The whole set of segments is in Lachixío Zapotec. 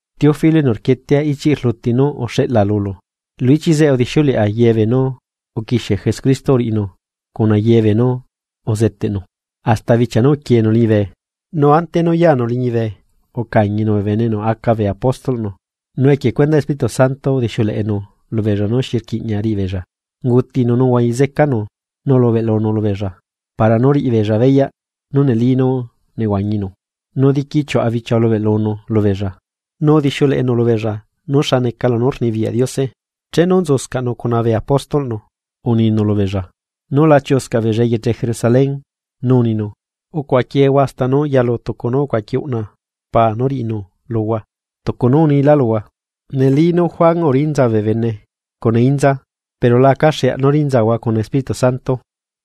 Teófilo enu rquietea, ichiꞌ rluti nú uxeꞌla lulu, lu ichiꞌ zeꞌe udixiuleꞌa ye beenú uquixie Jesucristo uriꞌinu cuna ye beenú uzeteꞌnu, hasta bichia nú uquienu liñibe. Nu ante nú yanu liñibe, ucañinu bee bene enu aca bee apóstolꞌnu, nu equie cuendaꞌ Espíritu Santo, udixiuleꞌenu lubeella nú xi rquiꞌña riꞌibeella. Ungutinu nu uhuañi zecanu nu ulubeꞌlunu lubeella para nú riꞌibeella beyaꞌ nú neli nú nehuañinu, nu diqui chiuꞌa bichia ulubeꞌlunu lubeella, nu udixiuleꞌenu lubeella nú xa neca lunú rnibiyaꞌ Diose. Chenu nzuscaꞌnu cuna bee apóstolꞌnu, uninu lubeella nú la chiuꞌuscaꞌ beella eyeche Jerusalén. Nu uninu: ―Ucuaꞌaquiehua hasta nú yalu tucu nú ucuaqui uꞌna Paa nú riꞌinu luhua, tucu nú unilá luhua. Neli nú Juan urinza bee bene cuna inza, pero la acaxeaꞌ nú rinzahua cuna Espíritu Santo.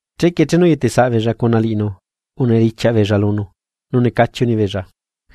Chequie chenu uyetesaꞌbeella cuna liꞌinu, unidichiaꞌ beella lunu nu necachi unibeella: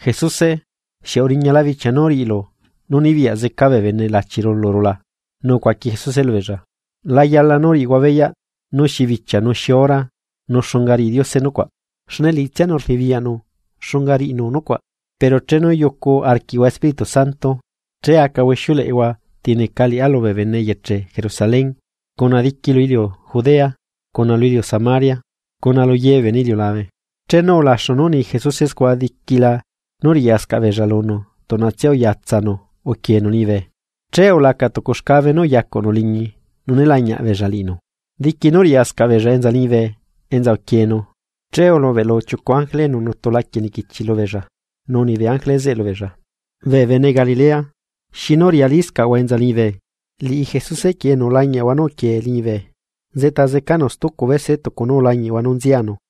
―Jesuse, ¿xieꞌ uriñala bicha nú riꞌilu nú nibiyaꞌ zeca bee bene lachiru luru la? Nu ucuaqui Jesuse lubeella: ―La yala nú riꞌihua beyaꞌ nú xi bichia nu xi hora nu xunga riꞌi Diose nucuaꞌ, xne liꞌitsianu rnibiyaꞌnu xunga riꞌinu nucuaꞌ; pero chenu yucu arquiꞌhua Espíritu Santo, che acahua ixiuleꞌehua ti neca liꞌá lubee bene eyeche Jerusalén, cuna diqui lu iliu Judea cuna lu iliu Samaria, cuna lu ye bee bene iliulabe. Chenu ulaxu nú uni Jesuse scua diquila nú riꞌyascaꞌ beella lunu tuꞌnatsia uyatsanu uquienu liñibe, che ulaca tucu xcabe nú uyacuꞌnu liñi nu né lañiaꞌ beella liꞌinu. Diqui nú riꞌyascaꞌ beella enza liñibe enza uquienu, che ulubeꞌlu chiucu ángele enu nutu laquie niquichi lubeella, nu uni bee ángele zeꞌe lubeella: ―Bee bene Galilea, ¿xinu riꞌyaliscaꞌhua enza liñibe? Liꞌi Jesuse quieꞌ enu ulañiaꞌahua nú uquie liñibe, nzeꞌta zecanu stucu bese tucu nú ulañiꞌhua nú nzianu.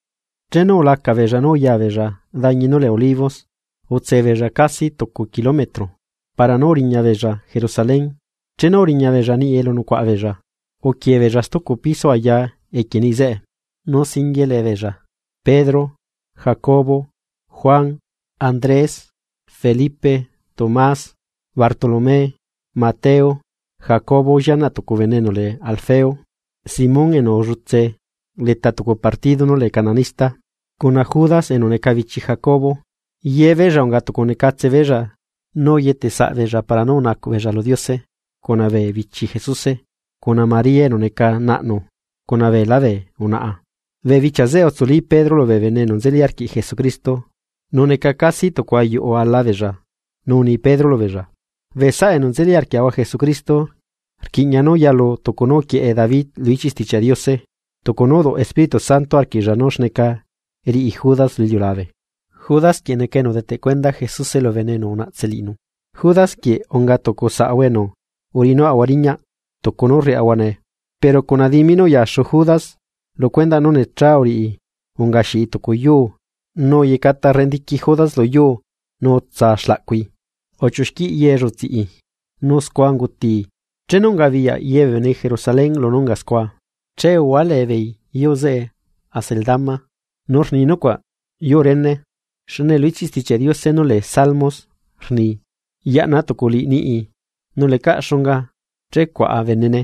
Chenu ulaca beella nú uya beella dañi nú lee Olivos, utse beella casi tucu kilometro para nú uriña beella Jerusalén. Chenu uriña beella niꞌi elu nucuaꞌa beella, uquie beella stucu piso aya equie niꞌi zeꞌe. Nu singuie lee beella, Pedro, Jacobo, Juan, Andrés, Felipe, Tomás, Bartolomé, Mateo, Jacobo llianaꞌ tucu bene enu lee Alfeo, Simón enu ulletse leta tucu partido nú lee cananista, cuna Judas enu neca bichi Jacobo. Yebeella unga tucu necatse beella nu uyete saꞌbeella para nú unacuꞌ beella lu Diose cuna bee bichi Jesuse, cuna María enu neca naꞌnu, cuna beelá bee unaꞌa. Bee bichia zeꞌe utsuli Pedro lubee bene enu nzeli arquiꞌ Jesucristo, nu neca casi tucu ayuꞌu ala beella, nu uni Pedro lubeella: ―Bee saꞌa enu nzeli arquiaꞌahua Jesucristo, rquiꞌña nú yalu tucu nú uquieꞌe David lu ichiꞌ Stichiaꞌ Diose, tucu nú uduꞌ Espíritu Santo arquiꞌlla nú xneca riꞌi Judas lu iliulabe, Judas quieꞌ neca enu udeteꞌ cuenda Jesuse lubee bene enu unaꞌtse liꞌinu. Judas quieꞌ unga tucu saꞌahua enu, uriꞌinuaꞌahua riñaꞌ tucu nú rriaꞌahua nee. Pero cuna dimi nú uyaxu Judas lu cuendaꞌ nú necha uriꞌi ungaxiꞌi tucu yuu, nu uyecata rendiqui Judas lu yuu nu utsa xlaꞌcui uchiuxquiꞌ ye llutsiꞌi, nu scua ungutii. Chenu ungabiyaꞌ ye bee bene Jerusalén lunú unga scua, che uhualee beei yuu zeꞌe Acéldama, nu rni nucuaꞌ yuu réne. Xne lu ichiꞌ Stichiaꞌ Diose nú lee Salmos rni: Yaꞌna tuculiꞌ niꞌii, nu lecaꞌ xunga che cuaꞌa benene.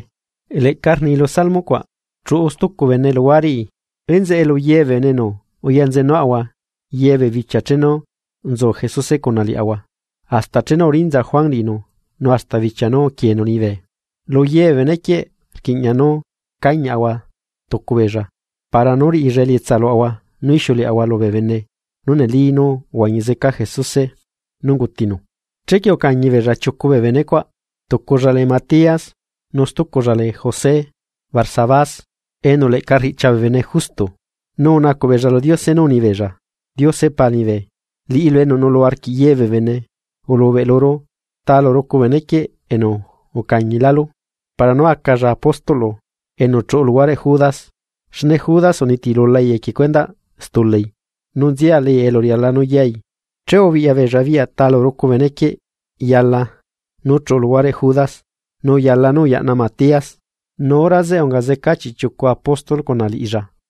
Leꞌca rni lu Salmos cuaꞌ: Chuꞌu stucu bene luhuareꞌi. ’Enzeꞌe lu ye bee bene enu uyanzenuaꞌahua ye bee bichia chenu nzu Jesuse cuna liaꞌahua, hasta chenu urinza Juan liꞌinu nu hasta bichia nú uquienu liñibe. Lu ye bee benequieꞌ rquiꞌña nú cañiaꞌahua tucu beella para nú riꞌilla elietsa luaꞌahua nú ixiuleꞌahua lubee bene nú neli nú uhuañi zeca Jesuse nú ungutinu. Chequie ucañi beella chiucu bee bene cuaꞌ: tuculla lee Matías, nu stuculla lee José Barsabás, enu leꞌca riꞌchia bee bene Justo. Nu unacuꞌ beella lu Diose nú unibeella: ―Diose Pa liñibe, liꞌilu enu nuꞌlu arquiꞌ ye bee bene, ulubeꞌluru ta lu rucu benequieꞌ enu ucañilálu para nú acalla apóstolꞌlu enu chuꞌu luhuareꞌ Judas xne Judas unitilulai equie cuendaꞌ stulai, nu nzialai elu riala nú yai. Che ubiꞌya beella biꞌya ta lu rucu bene quieꞌ yala nú chuꞌu luhuareꞌ Judas nu uyala nú uyaꞌna Matías, nu hora zeꞌe unga zeca chiꞌchiucu apóstol cuna liꞌilla.